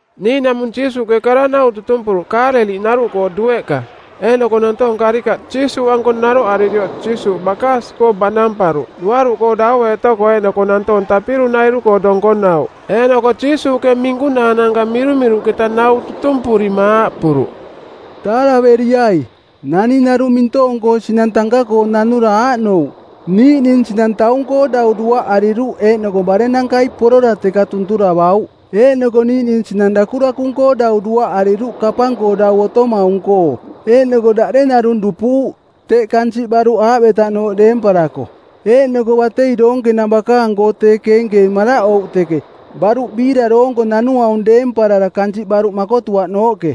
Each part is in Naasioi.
Niiꞌnaꞌmung Jiisuuꞌke kara nau tutumpuruꞌ Kaaleliꞌnaruꞌkoo dueꞌka. Eeꞌnoko nantoong karikaꞌ Jiisuuꞌanko naroꞌaririoꞌ Jiisuuꞌ bakaasi-koo baꞌnamparuꞌ nuaruꞌkoo daue otoko eeꞌnoko nantoong tapiru-nairu-koo donkonauꞌ. Eeꞌnoko Jiisuuꞌke minkunaananka mirumiruꞌketa nau tutumpurima aaꞌpuruꞌ, “Taaraveriai. Naning narung mintoong-koo sinang tanka-koo nanura aaꞌnouꞌ: Niiꞌning sinang taung-koo dau duaꞌariruꞌ eeꞌnoko barennankai porora teka tunturavauꞌ. Eeꞌnoko niiꞌning sinang dakurakung-koo dau duaꞌariruꞌ kapang-koo dau otomaung-koo, eeꞌnoko daꞌdeng narung dupuuꞌ, teꞌ kansiꞌ baruꞌ aavetaꞌnooꞌ deemparako. Eeꞌnoko batei doonkenang bakaang-koo tee keenkeeng maraꞌouꞌ teke, baruꞌ biira doonko nanuaung deemparara kansiꞌ baruꞌ makotuaꞌnooꞌke.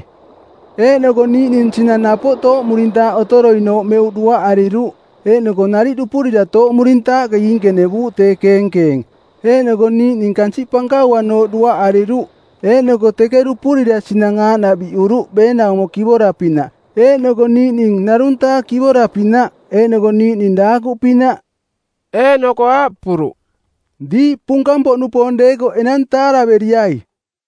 Eeꞌnoko niiꞌning sinang napoꞌ tooꞌmurintaaꞌ otoroinooꞌ meuꞌ duaꞌariruꞌ eeꞌnoko nariꞌ dupurira tooꞌmurintaaꞌke iinkenevuuꞌ tee keenkeeng. Eeꞌnoko niiꞌning kansiꞌ pankauanooꞌ duaꞌariruꞌ eeꞌnoko teke dupurira sinang aaꞌnaꞌ biꞌuruꞌ beenaumo kivora-pinaꞌ eeꞌnoko niiꞌning ˜narung-taa kivora-pinaꞌ eeꞌnoko niiꞌning daakuꞌpinaꞌ.” Eeꞌnoko aaꞌpuruꞌ, “Diiꞌ punkang-poꞌnupoong deekoꞌ enang taaraveriai!”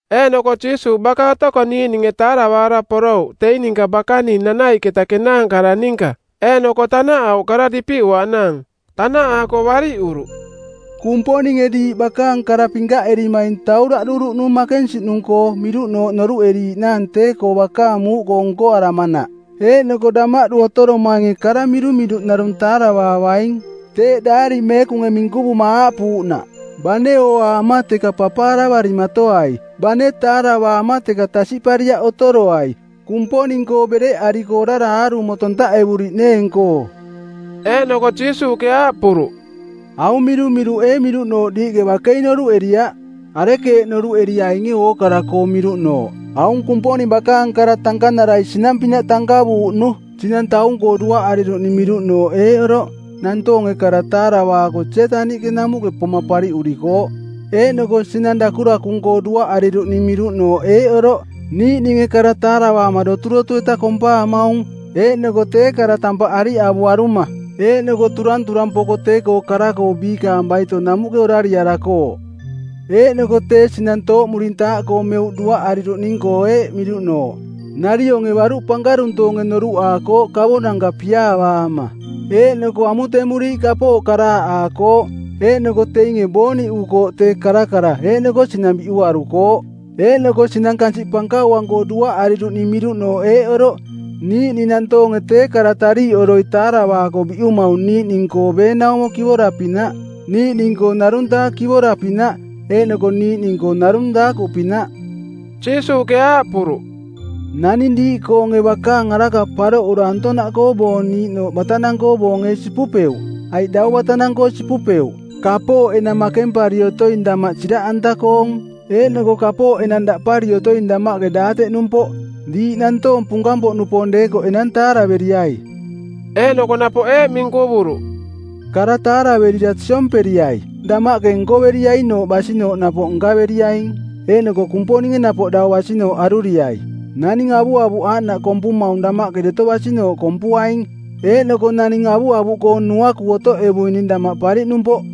Eeꞌnoko Jiisuuꞌ baka otoko niiꞌninge taaravaara porouꞌ teing ninka bakaning Nanaiꞌketa Kenaankara ninka, eeꞌnoko tanaꞌauꞌ kara dipiꞌuaꞌnaang. Tanaꞌaako bariꞌuruꞌ, “Kumponinge diiꞌ bakaang kara pinkaꞌerimaing tauraꞌduruꞌnung makensiꞌnung-koo miruꞌnooꞌ noruꞌeriiꞌnaang tee-koo bakaang muuꞌkoo nkoaramanaꞌ, eeꞌnoko damaꞌdu otoromainge kara mirumiruꞌ narung taaravaavaing. Teeꞌ Daari Meekunge minkuvuma aaꞌpuuꞌnaꞌ, ‘Bane ooaama teka papaaravarimatoai. Bane taaravaama teka tasiꞌpariaꞌ otoroai, Kumponing-koo bereꞌariko orara aarumo tontaꞌevuriꞌneeng-koo.’” Eeꞌnoko Jiisuuꞌke aaꞌpuruꞌ, “Aung mirumiruꞌ ee miruꞌnooꞌ diiꞌke bakei noruꞌeriaꞌ? Arekeeꞌ noruꞌeriainge ookara-koong miruꞌnooꞌ? Aung Kumponing bakaang kara tankanarai sinang pinaꞌ tankavuuꞌnu. Sinang taung-koo duaꞌariruꞌning miruꞌnooꞌ eeꞌ oroꞌ: Nantoonge kara taaravaako Sietaniꞌke namuꞌke poma pariꞌurikooꞌ. Eeꞌnoko sinang dakurakung-koo duaꞌariruꞌning miruꞌnooꞌ eeꞌ oroꞌ: Niiꞌninge kara taaravaama doturotu-eta kompaamaung. Eeꞌnoko tee kara tampaꞌ ariꞌavuaruma eeꞌnoko turanturang poko tee-koo kara-koo biikaang baito namuꞌke orariarakooꞌ. Eeꞌnoko tee sinang tooꞌmurintaaꞌkoo meuꞌ duaꞌariruꞌning-koo eeꞌ miruꞌnooꞌ: Narionge baruꞌ pankaruntoonge noruꞌaakooꞌ kavonanka piaavaama eeꞌnoko amutemuriiꞌ kapooꞌ karaaꞌaakooꞌ, eeꞌnoko teinge booniꞌukooꞌ tee karakara eeꞌnoko sinang biꞌuarukooꞌ. Eeꞌnoko sinang kansiꞌ pankauang-koo duaꞌariruꞌning miruꞌnooꞌ eeꞌ oroꞌ: Niiꞌning nantoonge tee kara tariiꞌoroi taaravaako biꞌumaung niiꞌning-koo beenaumo kivora-pinaꞌ, niiꞌning-koo ˜narung-taa kivora-pinaꞌ eeꞌnoko niiꞌning-koo narung daakuꞌpinaꞌ.” Jiisuuꞌke aaꞌpuruꞌ, “Naning diiꞌkoonge bakaang araka paroꞌura antonaꞌkoo boong niiꞌnooꞌ batanang-koo boong ee sipupeuꞌ? Aiꞌ dau batanang-koo sipupeuꞌ? Kapooꞌ enang makempari otoing damaꞌ siraꞌanta-koong. Eeꞌnoko kapooꞌ enang daꞌpari otoing damaꞌke daateꞌnumpoꞌ. Diiꞌ nantoong punkang-poꞌnupoong deekoꞌ enang taaraveriai!” Eeꞌnoko napoꞌ eeꞌ minkuvuruꞌ, “Kara taaraverira siomperiai. Damaꞌke nkoveriainooꞌ basinooꞌ napoꞌ nkaveriaing, eeꞌnoko Kumponinge napoꞌ dau basinooꞌ aruriai. Naning avuavuꞌ aaꞌnaꞌ kompumaung damaꞌke deto basinooꞌ kompuaing, eeꞌnoko naning avuavuꞌkoo nuaku otoꞌevuining damaꞌ pariꞌnumpoꞌ.”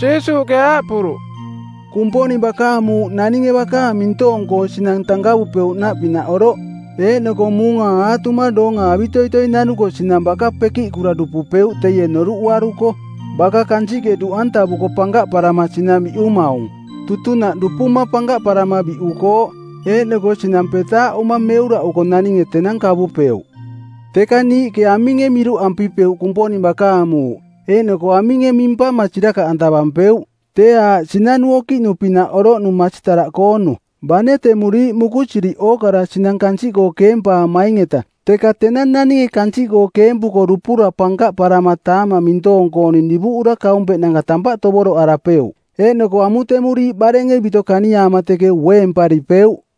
Jiisuuꞌke aaꞌpuruꞌ, “Kumponing bakaang muuꞌ naninge bakaang mintoong-koo sinang tankavupeuꞌnaꞌpinaꞌ oroꞌ. Eeꞌnoko muunga aatuma doonga avitoitoi nanuko sinang baka pekiꞌkura dupupeuꞌ teie noruꞌuaruko. Baka kansiꞌke duꞌantavuko pankaꞌparama sinang biꞌumaung. Tutunaꞌ dupuma pankaꞌparama biꞌukooꞌ. Eeꞌnoko sinang petaaꞌuma meuraꞌuko naninge tenang kavupeuꞌ.” “Teka niiꞌke aminge miruꞌampipeuꞌ Kumponing bakaang muuꞌ? Eeꞌnoko aminge mimpama sirakaꞌantavampeuꞌ? Tee aaꞌ sinanu okiꞌnu-pinaꞌ oroꞌnu masitaraꞌkoonu. Bane temuriiꞌ mukusiriꞌ ookara sinang kansiꞌkoo keempaamaing-eta, teka tenang naninge kansiꞌkoo keempuko dupura pankaꞌparama taamang mintoong-kooning divuꞌura kaumpeꞌnanka tampaꞌ tovoroꞌarapeuꞌ eeꞌnoko amutemuriiꞌ barenge bito kaniaama teke ueemparipeuꞌ.”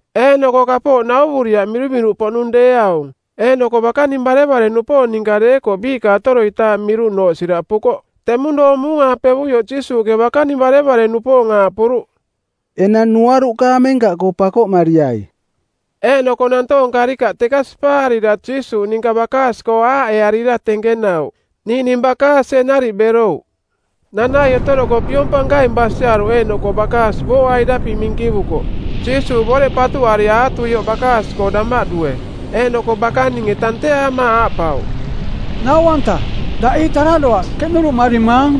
Eeꞌnoko kapooꞌ nauvuriaꞌ mirumiruꞌpoꞌnung deeaung. Eeꞌnoko bakaning barevare-nupoong ninka deekoꞌ biiꞌka otoroitaaꞌ miruꞌnooꞌ siraꞌpukoꞌ. Teꞌmung doong muung-aapevuioꞌ Jiisuuꞌke bakaning barevare-nupoong aaꞌpuruꞌ, “Enang nuaruꞌka amenkaꞌkoo pakoꞌmariai.” Eeꞌnoko nantoong karikaꞌ teka sipaarira Jiisuuꞌ ninka bakaasi-koo aaꞌearira tenkenauꞌ. Niiꞌning bakaasie nariꞌ berouꞌ. Nanai otoroko piong pankaing basiaruꞌ eeꞌnoko bakaasi booꞌai dapiꞌ minkivukoꞌ, Jiisuuꞌ boreꞌ patuꞌari aatuioꞌ bakaasi-koo damaꞌdue. Eeꞌnoko bakaninge tanteaama aaꞌpauꞌ, “Nau-anta, daꞌ ee taraꞌdoaꞌ keꞌnuruꞌmarimaang?”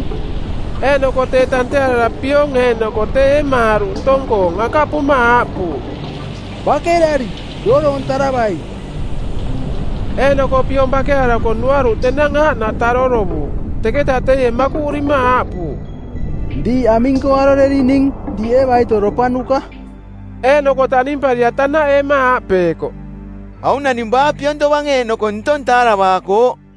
Eeꞌnoko tee tantearara piong eeꞌnoko tee eemaruꞌ ntong-koong akaꞌpuma aaꞌpuuꞌ, “Bakerari dooroontaravai.” Eeꞌnoko piong bakearako nuaruꞌ tenang aaꞌnaꞌ taarorovuuꞌ. Teketa teie makuꞌurima aaꞌpuuꞌ, “Diiꞌ aming-koo arorerining? Diiꞌ ee baitoropanuka?” Eeꞌnoko taꞌnimparira tanaꞌeema aaꞌpeekoꞌ, “Aung naning baa piong tovange eeꞌnoko ntong taaravaakooꞌ?”